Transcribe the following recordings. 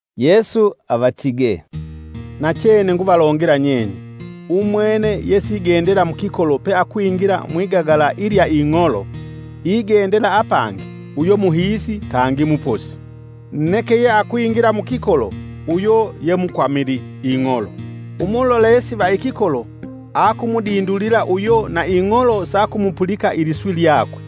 Yesu avatige, “Nachene nguvalongela nyenye; umwene yesigendela mukikolo peakwingila mwigagala ilya ing'olo igendela apangi uyo muhiisi kangi muposi. Neke yeakwingila mukikolo uyo yemukwamili ing'olo, Umulolesi va ikikolo akumudindulila uyo na ing'olo sakumupulika iliswi lyakwe,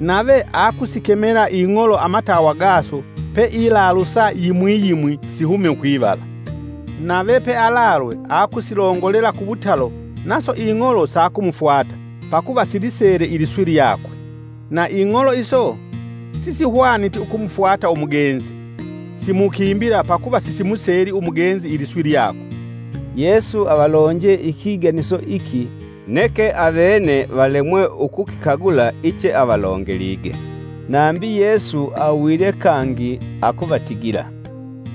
nave akusikemala ing'olo amatawa gaso peilalusa yimwi yimwi sihume kwivala. Nave pealalwe, akusilongolela kuwutalo, naso ing'olo sakumufwata, pakuva silisele iliswi lyakwe. Na ing'olo iso, sisihwaniti ukumufwata umugenzi, simukimbila pakuva sisimuseli umugenzi iliswi lyakwe.” Yesu avalonje ikiganiso iki neke avene valemwe ukukikagula icheavalongelige. Nambi Yesu awilye kangi akuvatigila,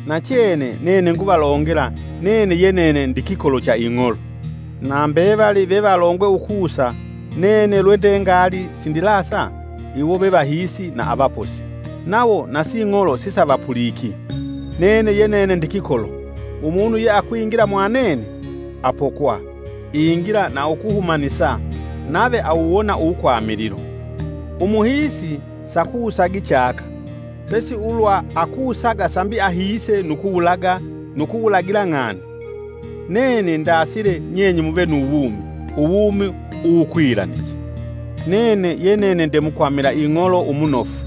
“Nachene nene nguvalongela nene ye nene ndikikolo cha ing'olo. Na mbevali vevalongwe ukusa, nene lwende ngali sindilasa, iwo ve vahisi na avaposi, nawo na sing'olo sisavapuliki. Nene ye nene ndikikolo, umunu yeakwingila mwa nene, apokwa, ingila nu ukuhumanisa, nave awuwona uwukwamililo. Umuhiisi sakusagi chaka, pesi ulwa akusaga sambi ahiise nu kuwulaga nu kuwulagila ng'ani. Nene ndasile, nyenye muve nu wumi, uwumi uwukwilaniche. “Nene ye nene nde mukwamila ing'olo umunofu.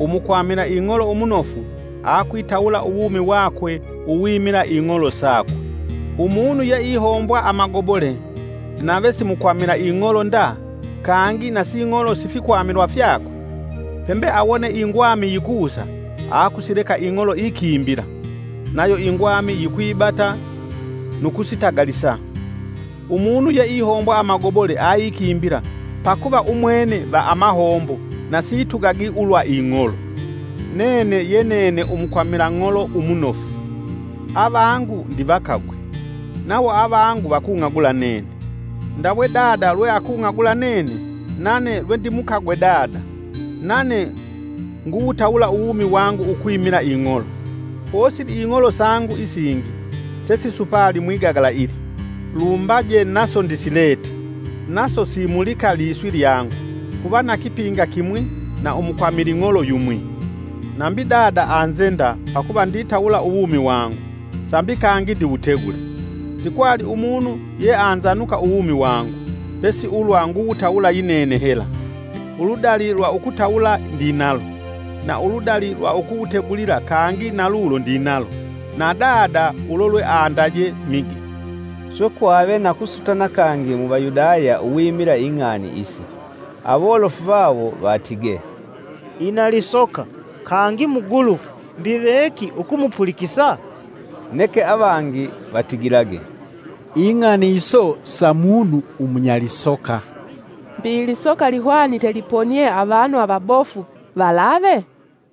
Umukwamila ing'olo umunofu akwitawula uwumi wakwe uwimila ing'olo sakwe. Umunu ye ihombwa amagobole, nave si mukwamila ing'olo nda kangi na sing'olo si fikwamilwa fyakwe, pembe awone ingwami yikusa, akusileka ing'olo ikimbila. Nayo ingwami yikwibata nu kusitagalisa. Umunu ye ihombwa amagobole aikimbila pakuva umwene va amahombo na situgagi ulwa ing'olo. Nene ye nene umukwamila ng'olo umunofu. Avangu ndivakagwe, nawo avangu vakung'agula nene, ndawe dada lweakung'agula nene nane lwendimukagwe Dada. Nane nguwutawula uwumi wangu ukwimila ing'olo. Posili ing'olo sangu isingi sesisupali mwigagala ili, lumbaje naso ndisilete; naso simulika liswi lyangu. Kuva na kipinga kimwi na umukwamili ng'olo yumwi. “Nambi Dada anzenda pakuva nditawula uwumi wangu, sambi kangi ndiwutegule. Sikwali umunu yeanzanuka uwumi wangu; pesi ulwa nguwutawula yinene hela. Uludali lwa ukutawula ndinalo, na uludali lwa ukuwutegulila kangi na lulo ndinalo. Na Dada ulo lweandaje mige.” Swe kwave na kusutana kangi mu Vayudaya uwimila ing'ani isi. Awolofu vawo vatige, “Ina lisoka; kangi mugulufu! Mbi veki ukumupulikisa?” Neke avangi vatigilage, “Ing'ani iso sa munu umunya lisoka, Mbi lisoka lihwanite liponie avanu avabofu valave?”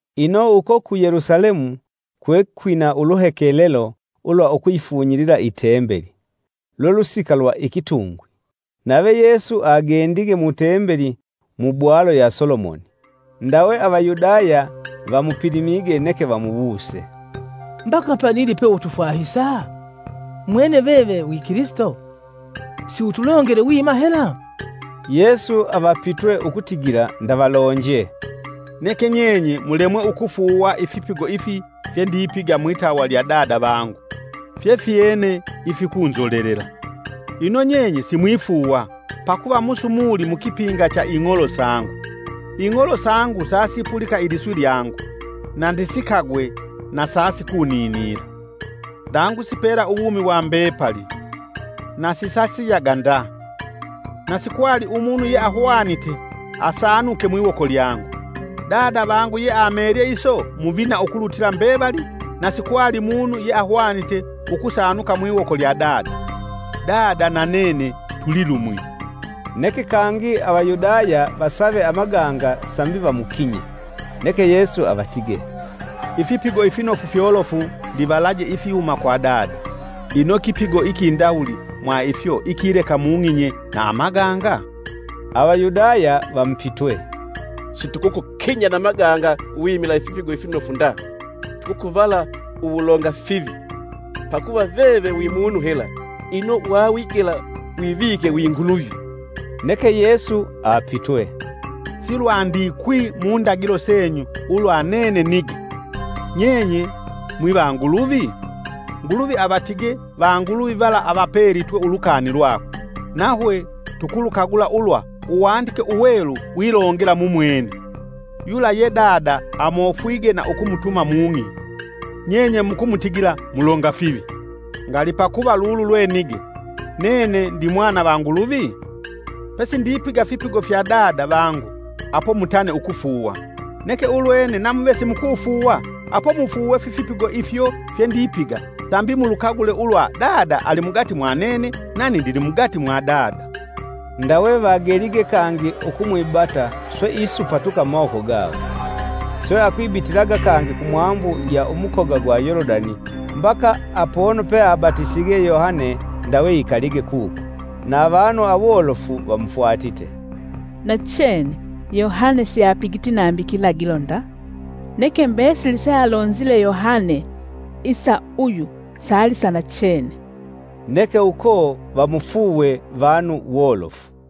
Ino uko ku Yelusalemu kwekwina uluhekelelo ulwa ukuyifunyilila itembeli. Lwe lusika lwa ikitungwi. Nave Yesu agendige mutembeli mu bwalo ya Solomoni. Ndawe Avayudaya vamupilimige neke vamuwuse, “Mbaka panili peutufwahisa? Mwene veve wi Kilisito. Siutulongele wima hela?” Yesu avapitwe ukutigila ndavalonje, “Neke nyenye mulemwe ukufuuwa. Ifipigo ifi fyendipiga mwitawa lya Dada vangu fyefyene ifikunzolelela. Ino nyenye simwifuuwa, pakuva musumuli mukipinga cha ing'olo sangu. Ing'olo sangu sasipulika iliswi lyangu; na ndisikagwe, na sasikuninila. Ndangusipela uwumi wa mbepali, na sisasiyaga nda. Na sikwali umunu yeahwanite asaanuke mwiwoko lyangu. Dada vangu yeamelye iso muvina ukulutila mbevali na sikwali munu yeahwanite ukusaanuka mwiwoko lya Dada. Dada na nene tulilumwi.” Neke kangi Avayudaya vasave amaganga sambi vamukinye. Neke Yesu avatige, “Ifipigo ifinofu fyolofu ndivalaje ifihuma kwa Dada, ino kipigo ikindawuli mwa ifyo ikileka mung'inye na amaganga?” Avayudaya vamupitwe, “Situkukukinya na amaganga wimila ifipigo ifinofu nda, tukukuvala uwulonga fivi! Pakuva veve wimunu hela, ino wawigela wivike wi Nguluvi.” Neke Yesu apitwe, “Si lwandikwi mundagilo senyu ulwa nene nige, ‘Nyenye mwivanguluvi?’ Nguluvi avatige vanguluvi vala avapelitwe ulukani lwakwe, nahwe tukulukagula ulwa Uwandike Uwelu wilongela mumwene. Yula ye Dada amofwige na ukumutuma mung'i, nyenye mukumutigila: ‘Mulonga fivi,’ ngali pakuva lulu lwe nige: ‘Nene ndimwana va Nguluvi?’ Pe sindipiga fipigo fya Dada vangu apo mutane ukufuuwa. Neke ulwene namuve simukufuuwa apo mufuuwe fifipigo ifyo fyendipiga sambi mulukagule ulwa Dada alimugati mwa nene nani ndilimugati mwa Dada.” Ndawe vagelige kangi ukumwibata swe isupatuka mumawoko gawo! Swe akwibitilaga kangi kumwambu ya umukoga gwa Yolodani mbaka apono peabatisige Yohane ndawe ikalige kuko. Na avanu awolofu vamufwatite, “Nachene Yohane siapigiti nambi kilagilo nda. Neke mbesili sealonzile Yohane isa uyu salisanachene.” Neke uko vamufuuwe vanu wolofu.